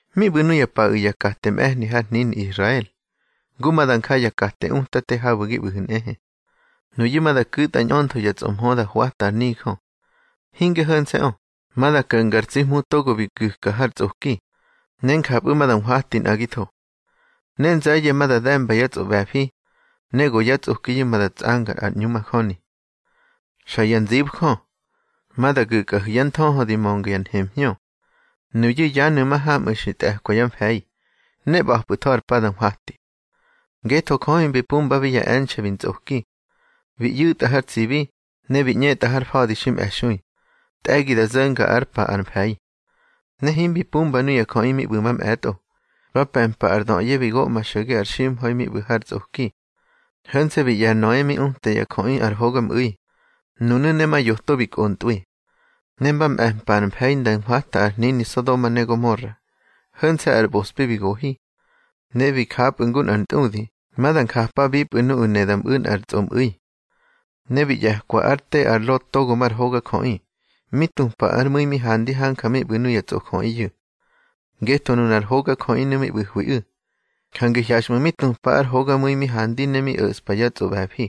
Mi ꞌbu̱ nuya paꞌu̱ ya kate mꞌe̱hni har hnini Israel, ngu ma da nja ya kate utate habu̱ gi ꞌbu̱hu̱ nꞌehe. Nuyu̱ ma da ku̱tꞌa ñꞌöntho ya tsꞌomhö da hwata ar nijö. Hinge ho̱nse̱ꞌö, ma da ko̱nga ar tsi Hmu togo bi gu̱ka har tsꞌoki, ne njapꞌu̱ ma da nhwati nꞌagitho. Ne nze̱ye̱ ma da de̱mba yá tsꞌoꞌbe̱fi, ne go yá tsꞌokiyu̱ ma da tsꞌanga ar ꞌñu majöni. Xa ya nzibjö, ma da gu̱kꞌahu̱ yá nthöhö di mönga ya nhemhñö. Nuyu̱ yanu̱ mahamꞌu̱ xi tꞌe̱kwa yá mfe̱i, ne ꞌba̱pꞌu̱tho ar pa da nhwati. Ngetho Jö himbi pumbabi ya e̱nxe̱ bi ntsꞌoki. Bi ꞌyu̱tꞌa har tsibi, ne bi ꞌñetꞌa har fa̱di xi mꞌe̱xui, tꞌe̱gi da zo̱nga ár pa ar mfe̱i. Ne himbi pumba nuya jöꞌi mi ꞌbu̱ mamꞌe̱tꞌo, ba pe̱mpa ar döꞌye bi goꞌma xo̱ge ar ximha̱i mi ꞌbu̱ har tsꞌoki. Ho̱nse̱ bi ꞌye̱ ar Noe mi uta ya jöꞌi ar hogamꞌu̱i, nunu̱ ne ma yoto bi kꞌontꞌwi. Ne mba mꞌe̱mpa ar mfe̱i nda nhwata ar hnini Sodoma ne Gomora, ho̱nse̱ ar ꞌbospi bi gohi. Ne bi japꞌu̱ ngu nꞌar ntꞌudi ma da njapabipꞌu̱ nuꞌu̱ ne da mꞌu̱ nꞌar tsꞌomꞌu̱i. Ne bi ꞌye̱kwa ár te ar Lot togo mar hogajöꞌi, mi tupa ár mu̱i mi handi hanja mi ꞌbu̱ nuya tsꞌojöꞌiyu̱. Ngetho nunar hogajöꞌinu̱ mi ꞌbu̱hwiꞌu̱, jange hyaxꞌmu̱ mi tupa ár hogamu̱i mi handi ne mi o̱ꞌspa yá tsꞌoꞌbe̱fi.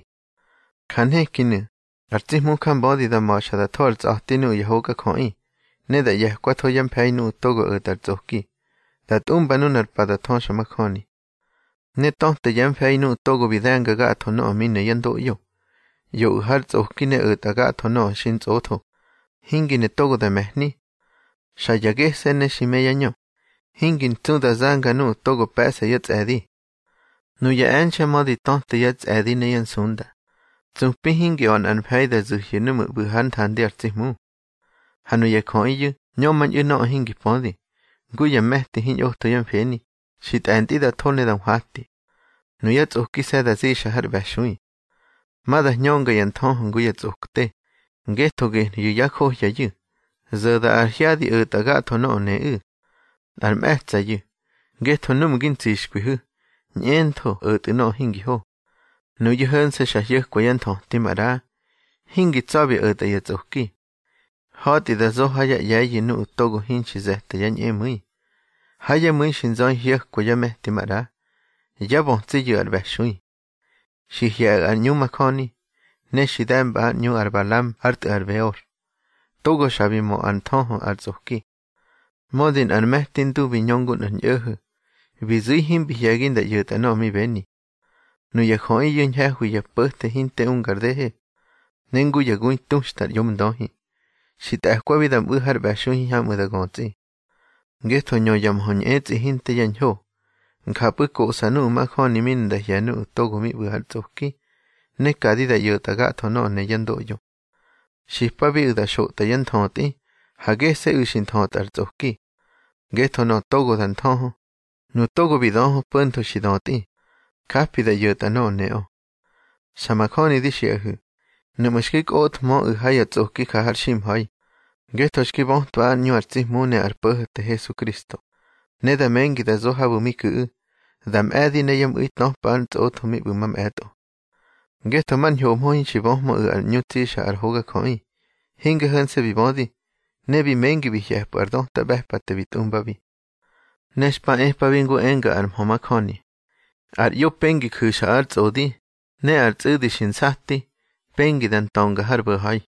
Ja nhekinu̱, ar tsi Hmu njambödi da ma̱xa da tho ar tsꞌa̱ti nuꞌu̱ ya hogajöꞌi, ne da ꞌye̱kwatho yá mfe̱i nuꞌu̱ togo o̱tꞌa ar tsꞌoki, da tꞌumba nunar pa da thöxamajöni. Ne töte yá mfe̱i nuꞌu̱ togo bi de̱nga gatho nöꞌö mi ne yá ndoꞌyo. ꞌYoꞌu̱ har tsꞌoki ne o̱tꞌa gatho nöꞌö xintsꞌotho, hingi ne togo da me̱hni. Xa ya gese̱ ne xi me yá ñö, hingi ntsu da zanga nuꞌu̱ togo pe̱ꞌsa yá tsꞌe̱di. Nuya e̱nxe̱ mödi töte yá tsꞌe̱di ne yá nsunda, tsupi hingi a̱ nꞌar mfe̱i da zu̱hyu̱ núꞌmu̱ ꞌbu̱ꞌu̱ hár nthandi ar tsi Hmu. Ha nuya jöꞌiyu̱ ñömañꞌu̱ nöꞌö hingi pödi, ngu ya me̱ti hiñꞌotho yá mfeni, xi tꞌe̱ntꞌi da tho ne da nhwati. Nuyá tsꞌokise̱ da zixa har ꞌbe̱xui. Ma da hñönga yá nthöhö ngu ya tsꞌokte, ngetho gehyu̱ yá johyayu̱, zo̱da ar hyadi o̱tꞌa gatho nöꞌö neꞌu̱. Nꞌar mꞌe̱tsa̱yu̱, ngetho núꞌmu̱ gi ntsixkwihu̱, ñꞌentho o̱tꞌu̱ nöꞌö hingi ho. Nuyu̱ ho̱nse̱ xa hyo̱kwa yá nthöti maꞌra, hingi tsa̱bi o̱tꞌa ya tsꞌoki. Ha̱tꞌi da zo ha yá ꞌye̱yu̱ nuꞌu̱ togo hinxi ze̱ta yá ñꞌemu̱i. Ha yá mu̱i xi nzöi hyo̱kwa yá me̱ti maꞌra. Yá bötsiyu̱ ar ꞌbe̱xui. Xi hye̱ꞌu̱ ar ꞌñu majöni, ne xi de̱mba ár ꞌñu ar Balam ár tꞌu̱ ar Beor, togo xa bi mö ár nthöhö ar tsꞌoki. Mödi nꞌar me̱ti ndu bi ñö ngu nꞌar ñꞌo̱ho̱, bi zu̱i himbi hye̱gi nda ꞌyo̱tꞌa nöꞌö mi beni. Nuya jöꞌiyu̱ ñhe̱hwi ya po̱the hinte unga ar dehe, ne ngu ya gui tuxta ar ꞌyomndöhi. Xi tꞌe̱kwabi da mꞌu̱ har ꞌbe̱xui hiñhamꞌu̱ da götsꞌi. Ngetho ñö ya mhö ñꞌetsꞌi hinte yá ñho. Njapꞌu̱ koꞌsa nuꞌu̱ majöni mi ne nda hye̱ nuꞌu̱ togo ꞌbu̱ har tsꞌoki, ne kadi da ꞌyo̱tꞌa gatho nöꞌö ne yá ndoꞌyo. Xipabiꞌu̱ da xotꞌa yá nthötꞌi, ha gese̱ꞌu̱ xi nthötꞌa har tsꞌoki. Ngetho nöꞌö togo da nthöhö, nu togo bi döhö po̱ntho xi dötꞌi, japi da ꞌyo̱tꞌa nöꞌö neꞌö. Xa majöni di xiꞌahu̱, nuꞌmu̱ xki kꞌothmöꞌu̱ ha ya tsꞌoki ja har ximha̱i ngetho xki bötwa ár ꞌñu ar tsi Hmu ne ar Po̱ho̱te Hesukristo, ne da mengi da zo habu̱ mi ku̱ꞌu̱, da mꞌe̱di ne yá mꞌu̱i töpa ár ntsꞌotho mi ꞌbu̱ mꞌe̱tꞌo. Ngetho mar ñhomhö hinxi böhmöꞌu̱ ar ꞌñu tsixa ar hogajöꞌi, hinge ho̱nse̱ bi bödi, ne bi mengi bi hye̱pꞌu̱ ar döta ꞌbe̱pate bi tꞌumbabi. Ne xpa epabi ngu enga ar mhö majöni: Ar ꞌyo pengi ju̱xa ár tsꞌodi, ne ar tsꞌu̱di xi nsati, pengi da ntönga har bo̱ha̱i.